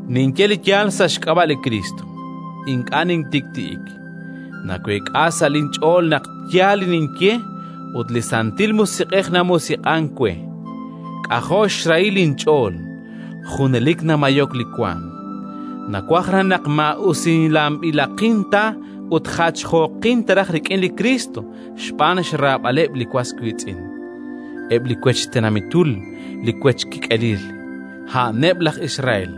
Ninye li yaal sa' xk'ab'a' li Kriist, ink'a' nintik'ti'ik; naweek'a sa' linch'ool naq yaal li ninye ut li Santil Musiq'ej namusiq'ank we. K'ajo' xrahil linch'ool, junelik namayok li waanm. Nawaj raj naq maa'usilanb'ilaqin ta ut jachjooqin raj rik'in li Kriist xb'aan xraab'aleb' li was wiitz'in, eb' li wech tenamitul li wech kik'elil. A'aneb' laj Israel.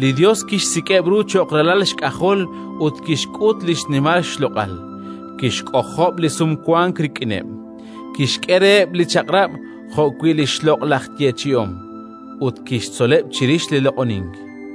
Li Yos kixsik'eb' ru cho'q ralal xk'ajol ut kixk'ut li xnimal xloq'al, kixk'ojob' li Sumwank rik'ineb', kixk'e reheb' li Chaq'rab' jo'wi' li xloq'laj yeechi'om, ut kixtzoleb' chirix li loq'onink.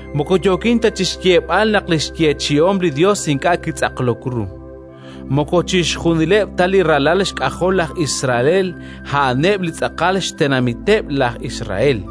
Moko yookin ta chi xyeeb'al naq li xyeechi'om li Yos ink'a' kitz'aqlok ru. Moko chixjunileb' ta li ralal xk'ajol laj Isael a'aneb' li xtz'aqal tenamiteb' laj Israel,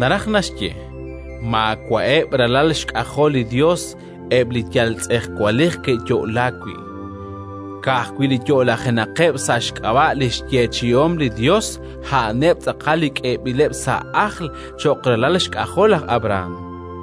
Naraj naxye: maawa'eb' ralal xk'ajol li Yos eb' li yal tz'ejwalej ke'yo'laak wi'; ka'ajwi' li yo'lajenaqeb' sa' xk'ab'a' li xyeechi'om li Yos, a'aneb' tz'aqal li k'eeb'ileb' sa' ajl cho'q ralal xk'ajol laj Abrahán.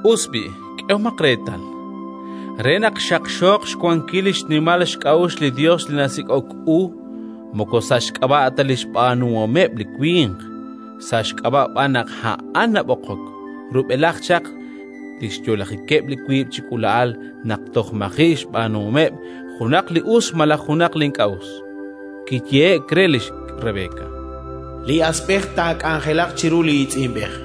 Us b'i', k'ehomaq reetal: re naq xaqxooq xwankil li xnimal xk'a'uxl li Yos li nasik'ok u moko sa' xk'ab'a' ta li xb'aanuhomeb' li winq, sa' xk'ab'a' b'an naq A'an nab'oqok, rub'elaj chaq li xyo'lajikeb' li wiib' chi k'uula'al naq toj maji' xb'aanuhomeb' junaq li us malaj junaq li ink'a' us, kiyehe'k re lix Rebeka: “Li asb'ej taak'anjelaq chiru li iitz'inb'ej”,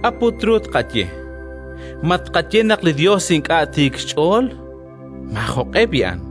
K'a' put ru tqaye? Ma tqaye naq li Yos ink'a' tiik xch'ool? Maajoq'e b'i'an!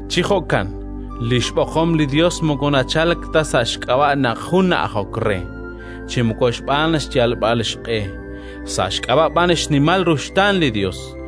Chi jo'kan li xb'oqom li Yos moko nachalk ta sa' xk'ab'a' naq jun na'ajok re, chi moko xb'aan xyalb'al xq'e, sa' xk'ab'a' b'an xnimal ruxtaan li Yos.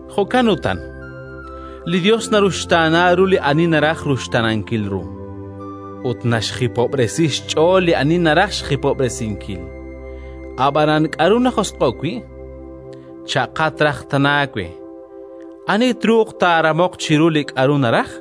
Jo'kan utan, li Yos naruxtaana ru li ani naraj ruxtaanankil ru, ut naxjipob'resi xch'ool li ani naraj xjipob'resinkil. “Ab'anan k'aru najosq'o'k wi'?”, cha'qat raj tana we. “Ani truuq taaramoq chiru li k'aru naraj?”.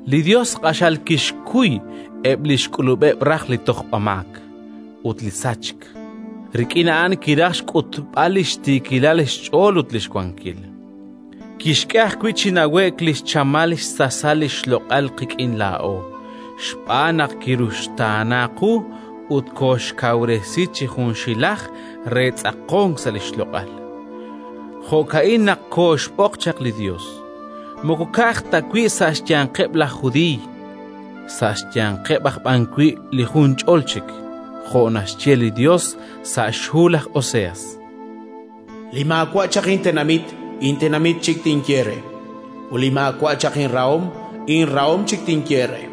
Li Yos q'axal kixkuy eb' li xk'ulub'eb' raj li tojb'amaak ut li sachk. Rik'in a'an kiraj xk'utb'al li xtiikilal xch'ool ut li xwankil. Kixk'e ajwi' chi nawe'k li xchamal xsasal li xloq'al qik'in laa'o, xb'aan naq kiruxtaana qu ut kooxkawresi chi junxilaj re tz'aqonk sa' li xloq'al. Jo'ka'in naq kooxb'oq chaq li Yos: moko ka'aj ta wi' sa' xyanqeb' laj Judiiy, sa' xyanqeb' aj b'an wi' li junch'ol chik. Jo' naxye li Yos sa' xhu laj Oseas: “Li maawa' chaq intenamit, intenamit chik tinye re; ut li maawa' chaq inrahom, inrahom chik tinye re.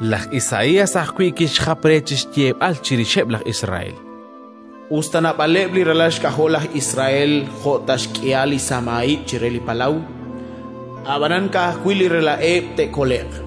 Laj Isaías ajwi' kixjap re chi xyeeb'al chirixeb' laj Israel: “Us ta naab'aleb' li ralal xk'ajol laj Israel jo' ta xk'ihal li samahib' chire li palaw, ab'anan ka'ajwi' li rela'eb' taakole'q.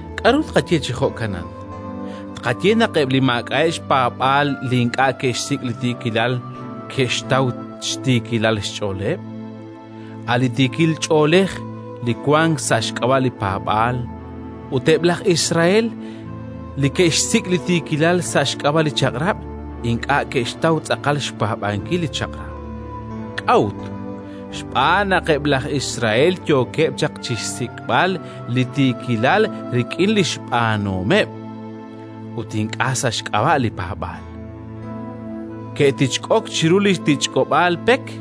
K'aru tqaye chi jo'kanan? Tqaye naq eb' li maak'a'eb' xpaab'aal li ink'a' ke'xsik' li tiikilal, ke'xtaw xtiikilal xch'ooleb', a' li tiikil ch'oolej li wank sa' xk'ab'a' li paab'aal; ut eb' laj Israel li ke'xsik' li tiikilal sa' xk'ab'a' li Chaq'rab', ink'a' ke'xtaw tz'aqal xpaab'ankil li Chaq'rab'. K'a'ut? Xb'aan naq eb' laj Israel yookeb' chaq chi xsik'b'al li tiikilal rik'in li xb'aanuhomeb', ut ink'a' sa' xk'ab'a' li paab'aal. Ke'tichk'ok chiru li tichk'ob'aal pek,